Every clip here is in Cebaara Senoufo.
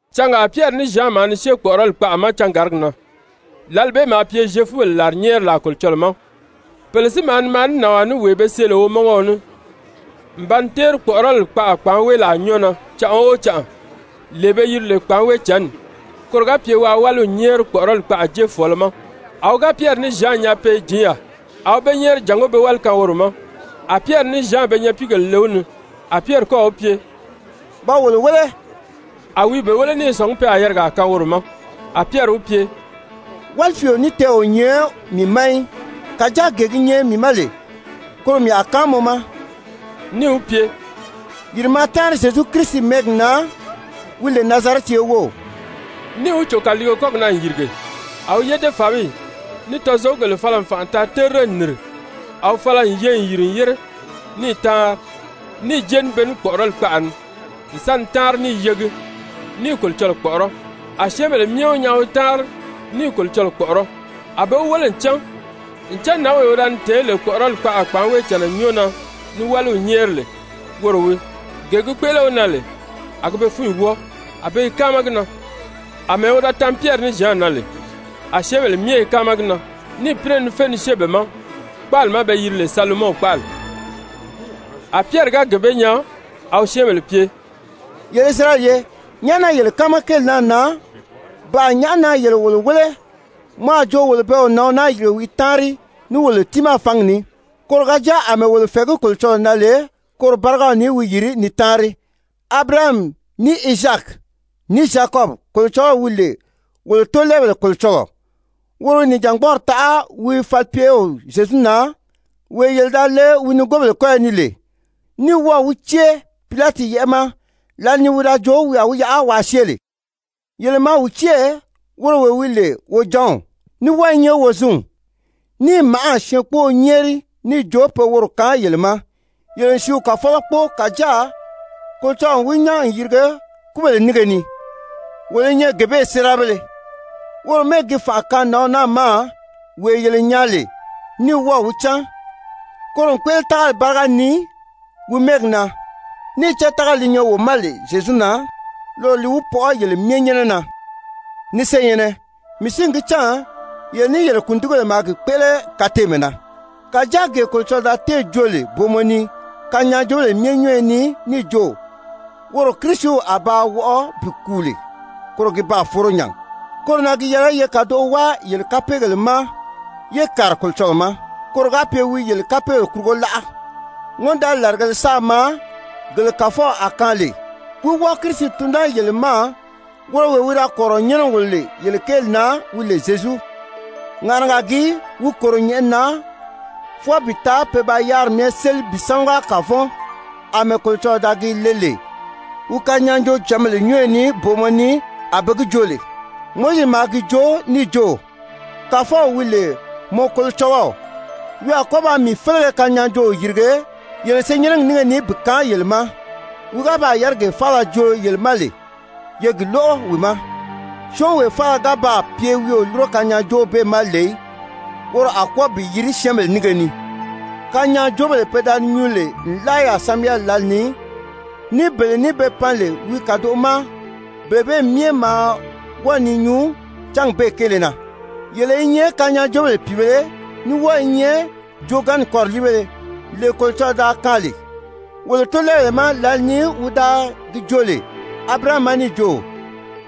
Cangaa Pyɛri ní Zyan maa ni syée kpɔ̀ʔɔrɔli kpaʔa ma cangàrigi na, lǎli bee maa pye Zyefubèle làrinyɛɛrilaa Kolocɔlɔɔ ma. Pèle si maa ni maa ní nànwaa ní wee be see lè womɔngɔɔ ní, n ba ni téeri kpɔ̀ʔɔrɔli kpaʔa kpàánweelaa nyɔ́ɔ na canʔa o canʔa, lee be yiri lè kpàánweejǎnni koro ga pye waa wáliw nyɛ́ɛri kpɔ̀ʔɔrɔli kpaʔa jéefɔɔlɔ ma. A wi ga Pyɛri ní Zyan nyaa pe i jǐn yaà, a wi be nyɛ́ɛri jàngó be wáli kaan woro ma. A Pyɛri ní Zyan be nyapiigèle le wi ni, a Pyɛri kɔ́ɔ̀ wi pye: «Da wolo wéle.» A wi i be wéle ní i sɔ̀ngí pe a yarigaa kaan woro ma. A Pyɛri wi pye: «Wálifiio ní tɛɛ̀ o nyɛ mii ma í. Kàjáa gee gi nyɛ mii ma lè, koro mii a kaan mɔ ma.» Níì wi pye: «Yìri maa táanri Zyezu Kirisi mɛ́ɛgi na wi lè Nazarɛti ye wów!» Níì wi cò kàliige kɔ́gi na n yìrige. A wi yédefabiyi ní tɔzogugèle fala n fànʔa taa terire n nìri. A wi fala n ye n yìri n yére ní i táanri, níì jée ní be ní kpɔ̀ʔɔrɔli kpaʔa ni n sa ni táanri, ní i yegi, ní i Kolocɔlɔɔ kpɔ̀ʔɔrɔ́. A syɛ́ɛnbèle myɛ wi nyaa wi i táanri ní i Kolocɔlɔɔ kpɔ̀ʔɔrɔ́. A be wi wéle n cán ncan nǎnwee wi da ni tɛ̀ɛ́n lè kpɔ̀ʔɔrɔli kpaʔa Kpàánweejànna nyɔ́ɔ na ni wáliw nyɛ́ɛri lè, woro wii, gee gi kpéʔele wi na lè, a gi be fúnyi wɔ́ɔ, a be i káama gi na. Amɛɛ wi da tan Pyɛri ní Zyan na lè, a syɛ́ɛnbèle myɛ i káama gi na, níì pínɛ ni fé ni syée be ma kpáali ma be yiri lè Salomɔn kpáali. A Pyɛri ga gee bee nyaa, a wi syɛ́ɛnbèle pye: «Yele Isirayɛli ye nyàʔá na yele káama kéeli naa na? Ba nyàʔá na yele wolo wéle mɔ a jo wolo bɛɛ wo nǎnw naa yìrige wi i táanri ní wolo tiimaa fǎngi ní, koro ga jáa àmɛɛ wolo fɛ̀ɛgí Kolocɔlɔɔ na lè, koro bárigaw ni wi yìri ni táanri? Abirahami, ní Izaaki, ní Zyakɔbi Kolocɔlɔw wi lè wolo tóolɛɛbèle Kolocɔlɔɔ, woro wi nìjangbɔɔri taʔa wi falipyew Zyezu na, wee yele da le wi nigoobèle kɔ́yɔ ni lè, ní wɔ́ɔ̀ wi cée Pilati yɛ́ʔɛ ma, lǎli ni wi da joo wi a wi yaʔa waa syée lè. Yele maa wi cée, woro wee wi lè Wojanw, ní wɔ́ɔ i nyɛ Wozinw, níì màʔâ syɛɛnkpóō nyɛ́ɛri níì jo pe woro kaan yele ma. Yele n sìíw Kàfɔlɔ kpóo, kàjáa Kolocɔlɔɔ n wi nyán n yirige kúbèle nínge ni. Wolo i nyɛ gee bee séerabéle. Woro mɛ́ɛgi gi fànʔa kaan nǎnw naa ma wee yele nyaa lè ní wɔ́ɔ̀ wi cán. Koro n kpéʔele tágali báriga ni wi mɛ́ɛgi na, níì cán tágali li nyɛ wo ma lè Zyezu na, loro li wi pɔʔɔ yele myɛ nyɛ́nɛ na. Ni senyɛ̀nnɛ, mii si n gi cán yele ní yele kùndigibèle maa gi kpéʔele kateemɛ na. Kàjáa gee Kolocɔlɔɔ da téè joo lè booma ni kanyaajoobèle myɛ nyɔ́ɔyɔ ni níì jo woro Kirisiw a ba wɔʔɔ bi kùu lè, koro gi baa foro nya. Koro na gi yɛlɛ ye kàdoʔo wáa yele kapeegèle ma yé kàri Kolocɔlɔɔ ma, koro ga pye wi yele kapeegèle kurugo láʔa, ŋɔ́ndaali làrigēle sáā maa gele Kàfɔw a kaan lè, wí wɔ́ɔ Kirisi tun naa yele ma, woro wee wi da kɔ̀rirɔ n nyɛ́nɛ n wòlo lè yele kéeli na, wi lè Zyezu. Ŋàʔanaga gii wi kòro nyɛ̀ʔɛni na fwɔɔ bi taa pe ba yáriri myɛ séli bi sámaga kàvɔn, àmɛɛ Kolocɔlɔɔ da gi le lè wi kanyaajoocǎnbèle nyɔ́ɔyɔ ni booma ni a be gi joo lè. Mowizi maa gi joo níì jo: ‹Kàfɔw wi lè mɔ Kolocɔlɔw wi a kɔ́ ba mii félege kanyaajooo yìrige yele senyɛnnɛgi nínge ni bi kaan yele ma. Wi ga baa yárigee faala joo yele ma lè, ye gi lóʔo wi ma. Syɔ́ɔnwee faala ga baa pye wi o lúro kanyaajoow bee ma lè í, woro a kwɔ́ɔ bi yirige syɛ́ɛnbèle nínge ni.› Kanyaajoobèle pe da ni nyuu lè nlaa yaà Samyɛli lǎli ni, ní bele ní be pan lè wi kàdoʔo ma, bele bee myɛ maa wɔ́ɔ ni nyuu cányi bee kéele na. Yele i nyɛ kanyaajoobèle pìibēle, ní wɔ́ɔ i nyɛ joogaanni kɔriliibéle, lee Kolocɔlɔɔ da kaan lè wolo tóolɛɛbèle ma lǎli ni wi da gi joo lè Abirahami ma níì jo: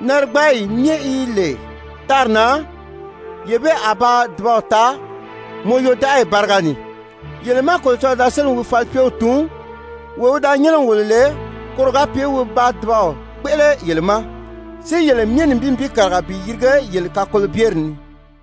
‹Narigbaayi myɛ yi lè tári na, yee bee a ba dùbaw taa mɔ yodaʔagi báriga ni.› Yele má Kolocɔlɔɔ da sélì wi falipyew tun, wee wi da nyɛ́nɛ n wòlo lè, koro ga pye wi ba dùbaw kpéʔele yele ma, si yele myɛ nibin nibin kàriga bi yirige yele kakolobyeri ni.»